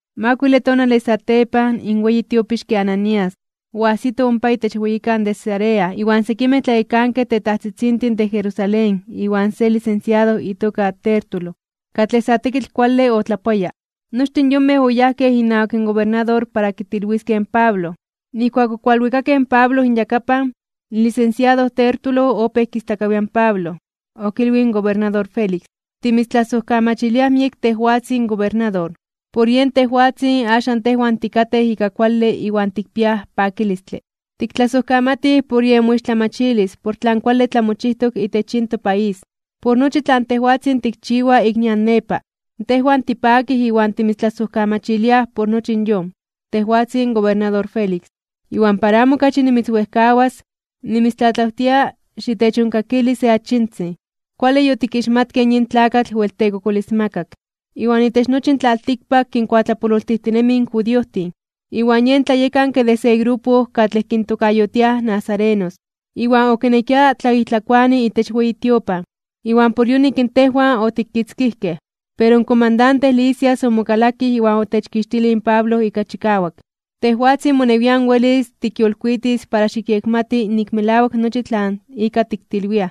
Makuile tonale satepan, in weyi tiopixke Ananías, oajsito ompa itech weyikan de Cesarea iwan sekimej tlayekankej tetajtzitzintin de Jerusalén iwan se lisensiado itoka Tértulo, katlej sa tekitl kuale otlapoaya. Nochtin yonmej oyajkej inawak in gobernador para kitilwiskej in Pablo. Nijkuak okualwikakej in Pablo inyakapan, in lisensiado Tértulo opéj kistlakawia in Pablo. Okilwij in gobernador Félix: ―Timitztlasojkamachiliaj miek tejwatzin gobernador. Por yen tejwatzin axan tejwan tikatej ika kuale iwan tikpiaj pakilistle. Tiktlasojkamatij por yen moixtlamachilis por tlan kuale tlamochijtok itech yin topaís. Por nochi tlan tejwatzin tikchiwa ik nian nepa, tejwan tipakij iwan timitztlasojkamachiliaj por nochi in yon, tejwatzin gobernador Félix. Iwan para amo okachi nimitzwejkawas, nimitztlatlawtia xitechonkakili se achitzin. Kuale yotikixmatkej yin tlakatl wel tekokolismakak. Iwan itech nochi in tlaltikpak kinkuatlapololtijtinemi in judiojtin. Iwan yen tlayekanke de se grupo katlej kintokayotiaj nazarenos. Iwan okinekia tlaijtlakoani itech weyi tiopan, iwan por yonik tejwan otikitzkijkej. Pero in komandante Lisias omokalakij iwan otechkixtilij in Pablo ika chikawak. Tejwatzin monewian welis tikyolkuitis para xikyekmati nik melawak nochi tlan ika tiktilwiaj.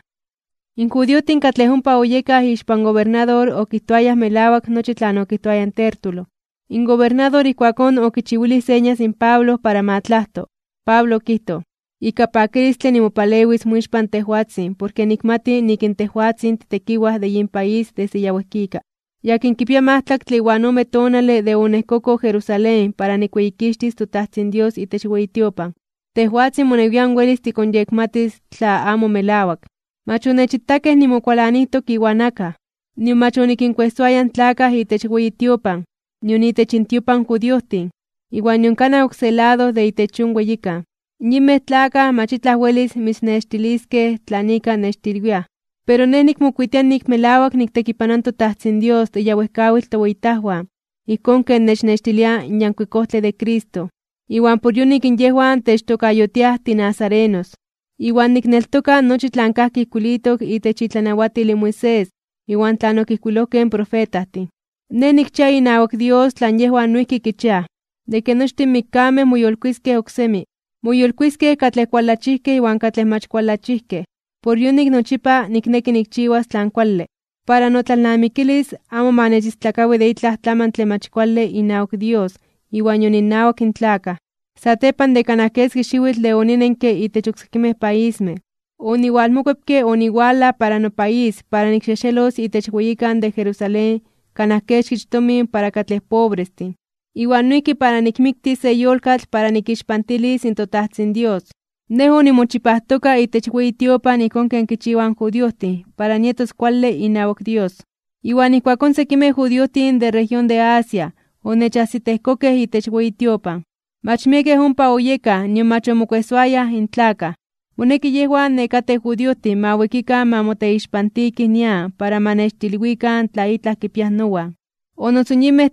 In judiojtin katlej ompa oyekaj ixpan gobernador okijtoayaj melawak nochi tlan okijtoaya in Tértulo. In gobernador ijkuakón okichiwilij señas in Pablo para ma tlajto. Pablo okijtoj: ―Ika pakilistle nimopalewis moixpan tejwatzin porke nikmati nik in tejwatzin titekiwaj de yin país desde ya wejkika. Yakin kipia majtlaktle iwan ome tonale de oniejkoko Jerusalén para nikweyikixtis in toTajtzin Dios itech weyi tiopan. Tejwatzin monewian welis tikonyekmatis tla amo melawak. Mach onechitakej nimokualanijtok iwan akaj, nion mach onikinkuejsoaya in tlakaj itech weyi tiopan, nion itech intiopan in judiojtin, iwan nion kanaj oksé lado de itech yon weyikan. Yinmej tlakaj mach itlaj welis mitznextiliskej de tlan ika nechtilwiaj. Pero nej nikmokuitia nik melawak niktekipanoa in toTajtzin Dios de ya wejkawitl toweyitajwan ijkón ken nechnextilia in Yankuik Ojtle de Cristo, iwan por yonik yejwan techtokayotiaj tinazarenos. Iwan nikneltoka nochi tlan kajki ijkuilitok itech itlanawatil in Moisés iwan tlan okijkuilojkej in profetajtin. Nej nikchia inawak Dios tlan yejwan noijki kichiaj, de ke nochtin mikkamej moyolkuiskej (moyolitiskej) oksemi. Moyolkuiskej katlej kualachijkej iwan katlej mach kualachijkej. Por yonik nochipa nikneki nikchiwas tlan kuale, para notlalnamikilis amo ma nechistlakawi de itlaj tlamantle mach kuale inawak Dios iwan nion innawak in tlakaj. ’Satepan de kanaj keski xiwitl de oninenke itech oksekimej paismej, oniwalmokuepke oniwalaj para nopaís para nikxejxelos itech weyikan de Jerusalén kanaj kexkich tomin para katlej pobrestin, iwan noijki para nikmiktis se yolkatl para nikixpantilis in toTajtzin Dios. Nej onimochipajtoka itech weyi tiopan ijkón ken kichiwaj in judiojtin para nietos kuale inawak Dios. Iwan ijkuakón sekimej judiojtin de región de Asia onechajsitejkokej itech weyi tiopan. Mach miekej ompa oyekaj nion mach omokuejsoayaj in tlakaj. Moneki yejwan nekatej judiojtin ma wikikan ma moteixpantikij nian para ma nechtilwikan tla itlaj kipiaj nowan. O noso in yinmej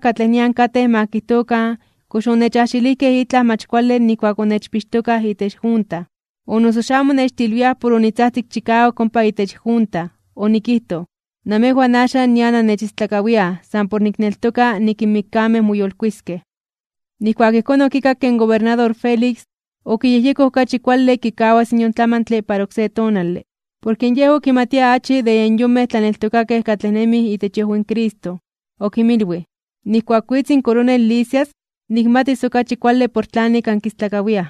katlej nian katej ma kijtokan kox onechajxilijkej itlaj mach kuale nijkuak onechpixtokaj itech junta. O noso xamo nechtilwiaj por onitzajtzik chikawak ompa itech junta. Onikijtoj: “Namejwan axan nian annechistlakawiaj san por nikneltoka nik in mikkamej moyolkuiskej (moyolitiskej).” Nijkuak ijkón okikakke in gobernador Félix, okiyejyekoj okachi kuale kikawas yon tlamantle para oksé tonale. Porke yej okimatia achi de yen yonmej tlaneltokakej katlej nemij itech iojwi in Cristo. Okinmilwij: ―Nijkuak witz in koronel Lisias, nikmatis okachi kuale por tlanik ankistlakawiaj.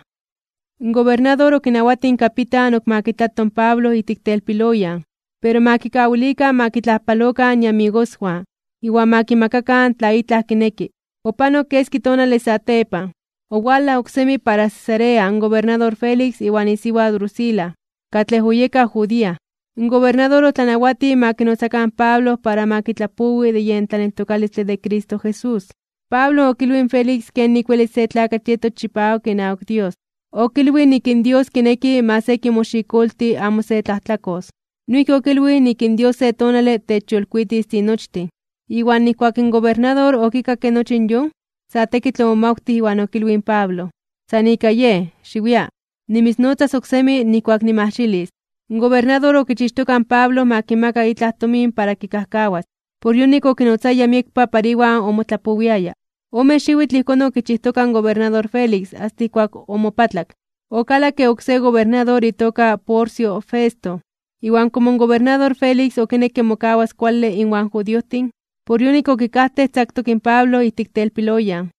In gobernador okinawatij in kapitan ok ma kitlato in Pablo ijtik telpiloyan, pero ma kikawilikan ma kitlajpalokan iamigoswan iwan ma kimakakan tla itlaj kineki. Opanok keski tonale satepan, owalaj oksemi para Cesarea in gobernador Félix iwan isiwa Drusila, katlej oyeka judía. In gobernador otlanawatij ma kinotzakan in Pablo para ma kitlapowi de yen tlaneltokalistle de Cristo Jesús. Pablo okilwij in Félix kenik welis se tlakatl yetos chipawak inawak Dios. Okilwij nik in Dios kineki ma se kimoxikolti amo se tlajtlakos. Noijki okilwij nik in Dios se tonale techyolkuitis tinochtin. Iwan nijkuak in gobernador okikakke nochi yon, sa tekitl omomawtij iwan okilwij in Pablo: ―San ika yej, xiwia. Nimitznotzas oksemi nijkuak nimajxilis. In gobernador okichixtoka in Pablo ma kimaka itlaj tomin para kikajkawas. Por yonik okinotzaya miekpa para iwan omotlapowiaya. Ome xiwitl ijkón okichijtoka in gobernador Félix asta ijkuak omopatlak. Okalakke oksé gobernador itoka Porcio Festo. Iwan komo in gobernador Félix okinekke mokawas kuale inwan judiojtin, por yonik okikajtej tzaktok in Pablo ijtik telpiloyan.